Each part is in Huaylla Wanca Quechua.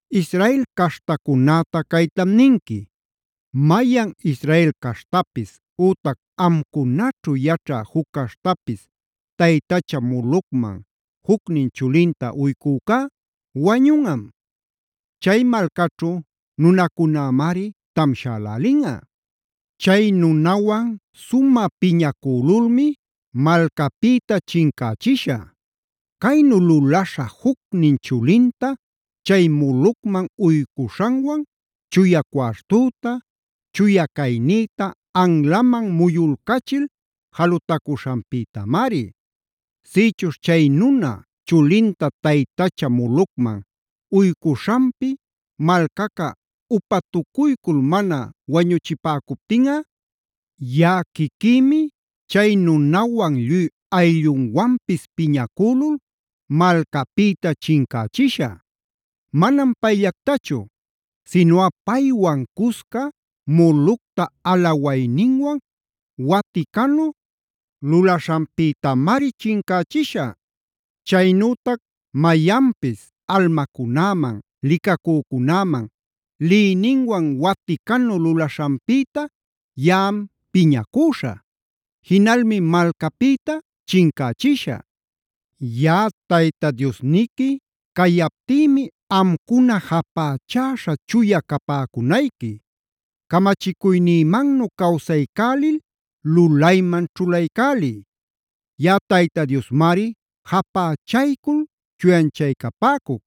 “Israel caśhtacunäta caytam ninqui: Mayan Israel caśhtapis, ütac amcunaćhu yaćha juc caśhtapis taytacha Molocman jucnin chulinta uycücá wañunꞌam; chay malcaćhu nunacunämari tamshälälinꞌa. Chay nunawan sumä piñacülulmi malcäpïta chincächishä. Caynu lulaśha jucnin chulinta chay Molocman uycuśhanwan chuya cuartüta, chuya caynïta anlaman muyulcachil jalutacuśhanpïtamari. Sïchuśh chay nuna, chulinta taytacha Molocman uycuśhanpi malcaca upatucuycul mana wañuchipäcuptinꞌa, yaꞌa quiquïmi chay nunawan lluy ayllunwanpis piñacülul malcapïta chincächishä. Manam payllactachu sinuꞌa paywan cusca Molocta alawayninwan waticanu lulaśhanpïtamari chincächishä. “Chaynütac mayanpis almacunäman, licacücunäman liyninwan waticanu lulaśhanpïta yaꞌam piñacüśhä. Jinalmi malcäpïta chincächishä. “Yaꞌa Tayta Diosniqui cayaptïmi amcuna japächäśha chuya capäcunayqui. Camachicuynïmannu cawsaycälil lulayman ćhulaycäliy. Yaꞌa Tayta Diosmari japächaycul chuyanchaycapäcuc.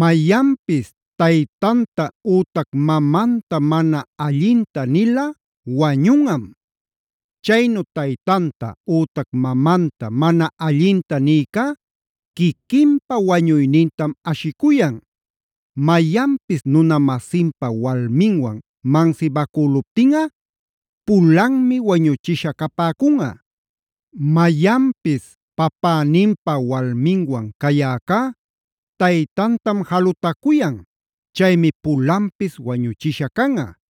“Mayanpis taytanta ütac mamanta mana allinta nilꞌa wañunꞌam.a Chaynu taytanta ütac mamanta mana allinta niycá quiquinpa wañuynintam ashicuyan. “Mayanpis nuna-masinpa walminwan mansibacüluptinꞌa pulanmi wañuchisha capäcunꞌa.b “Mayanpis papäninpa walminwan cayäcá taytantam jalutacuyan chaymi pulanpis wañuchisha canꞌa;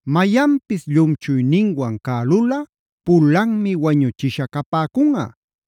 “Mayanpis llumchuyninwan cälulꞌa pulanmi wañuchisha capäcunꞌa.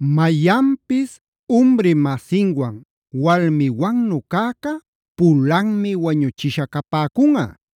“Mayanpis umri-masinwan walmiwannu cäcä pulanmi wañuchisha capäcunꞌa.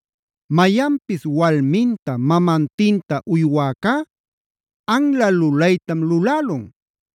“Mayanpis walminta mamantinta uywäcá anla lulaytam lulälun.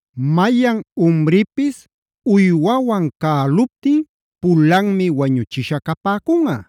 “Mayan umripis uywawan cäluptin, pulanmi wañuchisha capäcunꞌa.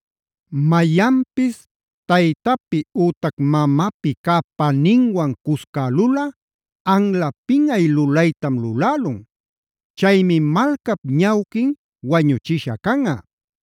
“Mayanpis taytapi ütac mamapi cä paninwan cuscälulꞌa anla pinꞌay lulaytam lulälun. Chaymi malcap ñawquin wañuchisha canꞌa.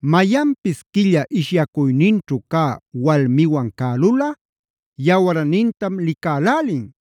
“Mayanpis quilla ishyacuyninćhu cä walmiwan cälulꞌa yawarnintam licälälin.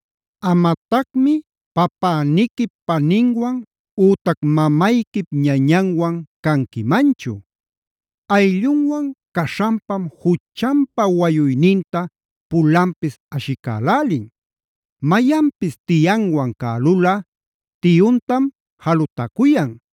“Amatacmi papäniquip paninwan ütac mamayquip ñañanwan canquimanchu. Ayllunwan caśhanpam juchanpa wayuyninta pulanpis ashicälälin. “Mayanpis tiyanwan cälulꞌa tiyuntam jalutacuyan.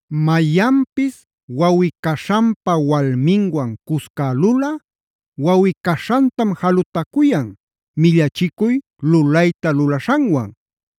“Mayanpis wawꞌi-caśhanpa walminwan cuscälulꞌa wawꞌi-caśhantam jalutacuyan, millachicuy lulayta lulaśhanwan.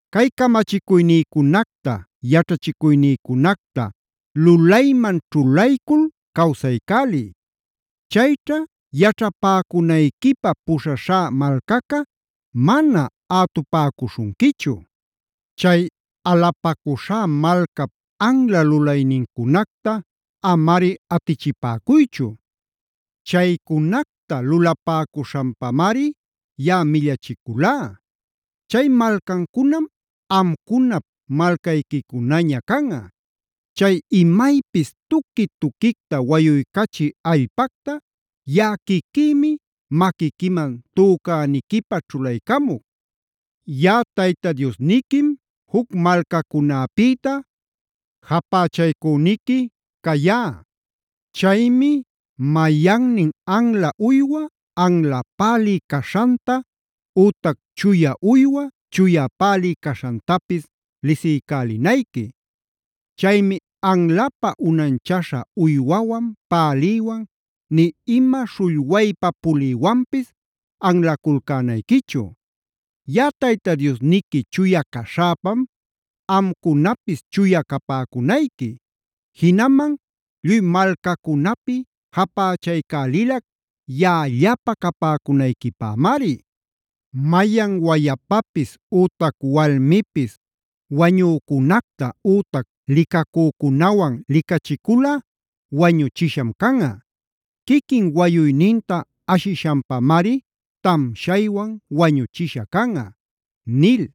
“Cay camachicuynïcunacta, yaćhachicuynïcunacta lulayman ćhulaycul cawsaycäliy. Chayćha yaćhapäcunayquipä puśhaśhä malcaca mana ätupäcuśhunquichu. Chay alupacuśhá malcap anla lulaynincunacta amari atichipäcuychu. Chaycunacta lulapäcuśhanpamari yaꞌa millachiculá. Chay malcancunam amcunap malcayquicunaña canꞌa. Chay imaypis tuqui-tuquicta wayuycachï allpacta yaꞌa quiquïmi maquiquiman tücäniquipä ćhulaycamuc. Yaꞌa Tayta Diosniquim juc malcacunäpïta japächaycüniqui cayá. Chaymi mayannin anla uywa, anla pälï caśhanta ütac chuya uywa, chuya pälï caśhantapis lisiycälinayqui. Chaymi anlapä unanchaśhä uywawan, pälïwan, nï ima śhullwaypa pulïwanpis anlaculcänayquichu. Yaꞌa Tayta Diosniqui chuya caśhäpam amcunapis chuya capäcunayqui. Jinaman lluy malcacunapi japächaycälilac yaꞌallapä capäcunayquipämari. “Mayan wayapapis ütac walmipis wañücunacta ütac licacücunawan licachiculꞌa wañuchisham canꞌa. Quiquin wayuyninta ashishanpamari tamshaywan wañuchisha canꞌa” nil.